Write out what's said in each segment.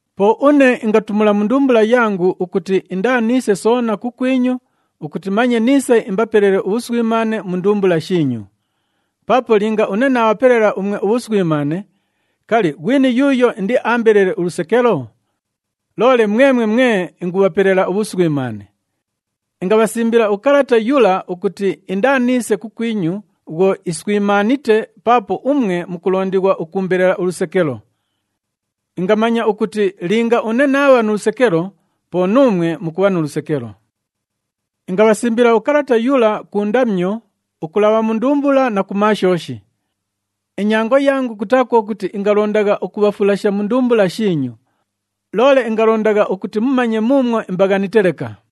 Po une ingatumula mu ndumbula yangu ukuti indaaniise soona kukwinyu ukuti manye niise imbapelele ubhuswimaane mu ndumbula shiinyu. Paapo linga une naabhapelela umwe ubhuswimaane, kali, ghwini yuuyo indiaambelele ulusekelo? Loole mwemwe mwe ingubhapelela ubhuswimaane. Ingabhasimbila ukalata yula ukuti indaaniise kukwinyu bhwo iswimaanite paapo umwe mukulondighwa ukuumbelela ulusekelo. Ingamanya ukuti linga une naabha nu lusekelo, po nuumwe mukubha nu lusekelo. Ingabhasimbila ukalata yula ku ndamyo, ukulabha mu ndumbula na ku maashooshi. Inyango yangu kutaa kwo kuti ingalondagha ukubhafulasha mu ndumbula shiinyu, loole ingalondagha ukuti mumanye muumwo imbaghanite leka.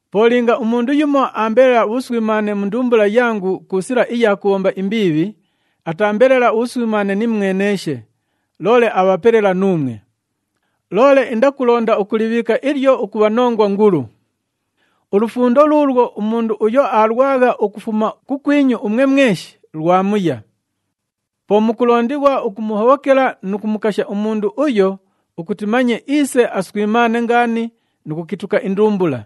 Po linga umundu yumo aambelela ubhuswimaane mu ndumbula yangu ku sila iya kubhomba imbiibhi, ataambelela ubhuswimaane nimweneeshe, loole abhapelela nuumwe. Loole indakulonda ukulibhiika ilyo ukubha nongwa ngulu. Ulufundo luulwo umundu uyo aalwagha ukufuma kukwinyu umwe mweshi, lwamuya. Po mukulondighwa ukumuhobhokela nu kumukasha umundu uyo ukuti manye iise aswimaane ngaani nu kukituka indumbula.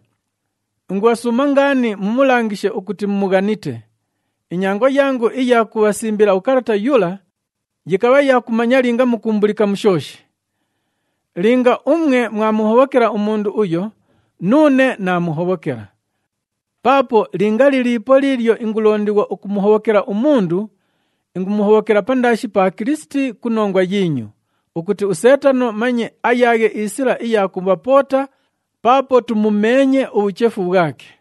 Ingubhasuuma ngaani mumulangishe ukuti mumughanite. Inyango yangu iya kubhasimbila ukalata yula, yikabha ya kumanya linga mukuumbulika mu shooshi. Linga umwe mwamuhobhokela umundu uyo, nuune naamuhobhokela. Paapo linga liliipo liilyo ingulondighwa ukumuhobhokela umundu, ingumuhobhokela pandaashi pa Kilisiti ku nongwa yiinyu, ukuti uSeetano manye ayaaghe isila iya kubhapoota, paapo tumumeenye ubhuchefu bhwake.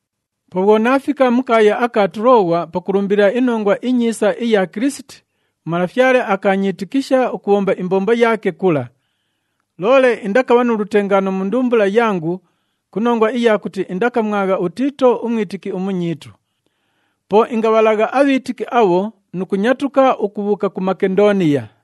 Po bhwo naafika mu kaaya aka Tulooghwa pakulumbilila iNongwa iNyiisa iya Kilisiti, uMalafyale akaanyiitikisha ukubhomba imbombo yaake kula. Loole indakabha nu lutengaano mu ndumbula yangu, ku nongwa iya kuti indakamwagha uTiito umwitiki umunyiitu. Po ingabhalagha abhiitiki abho nu kunyatuka ukubhuuka ku Makendooniya.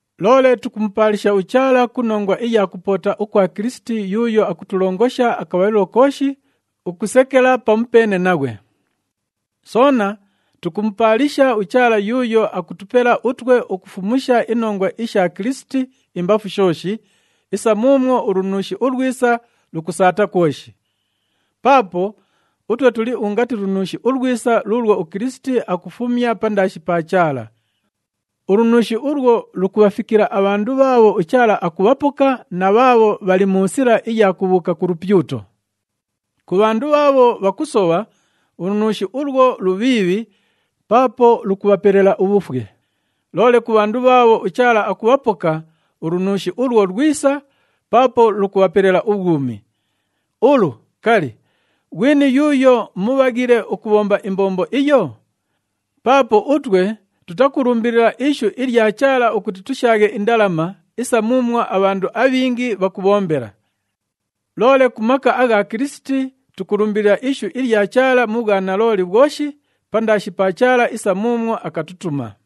Loole tukumupaalisha uChaala ku nongwa iya kupoota ukwa Kilisiti yuuyo akutulongosha akabhalilo kooshi ukusekela pamupeene naghwe. Soona tukumupaalisha uChaala yuuyo akutupela utwe ukufumusha inongwa isha Kilisiti imbafu shooshi, isa muumwo ulunuushi ulwisa lukusaata kwoshi. Paapo utwe tuli ungati lunuushi ulwisa luulwo uKilisiti akufumya pandaashi pa Chaala. Ulunuushi ulwo lukubhafikila abhandu bhaabho uChaala akubhapoka na bhaabho bhali mu sila iya kubhuuka ku lupyuto. Ku bhandu bhaabho bhakusobha, ulunuushi ulwo lubhiibhi paapo lukubhapelela ubhufwe. Loole ku bhandu bhaabho uChaala akubhapoka, ulunuushi ulwo lwisa paapo lukubhapelela ubhwumi. Ulu, kali, ghwini yuuyo mubhaghile ukubhomba imbombo iyo? Paapo utwe tutakulumbilila ishu ilya Chaala ukuti tushaaghe indalama, isa muumwo abhandu abhingi bhakubhombela. Loole ku maka agha Kilisiti, tukulumbilila ishu ilya Chaala mu bhwanalooli bhwoshi pandaashi pa Chaala isa muumwo akatutuma.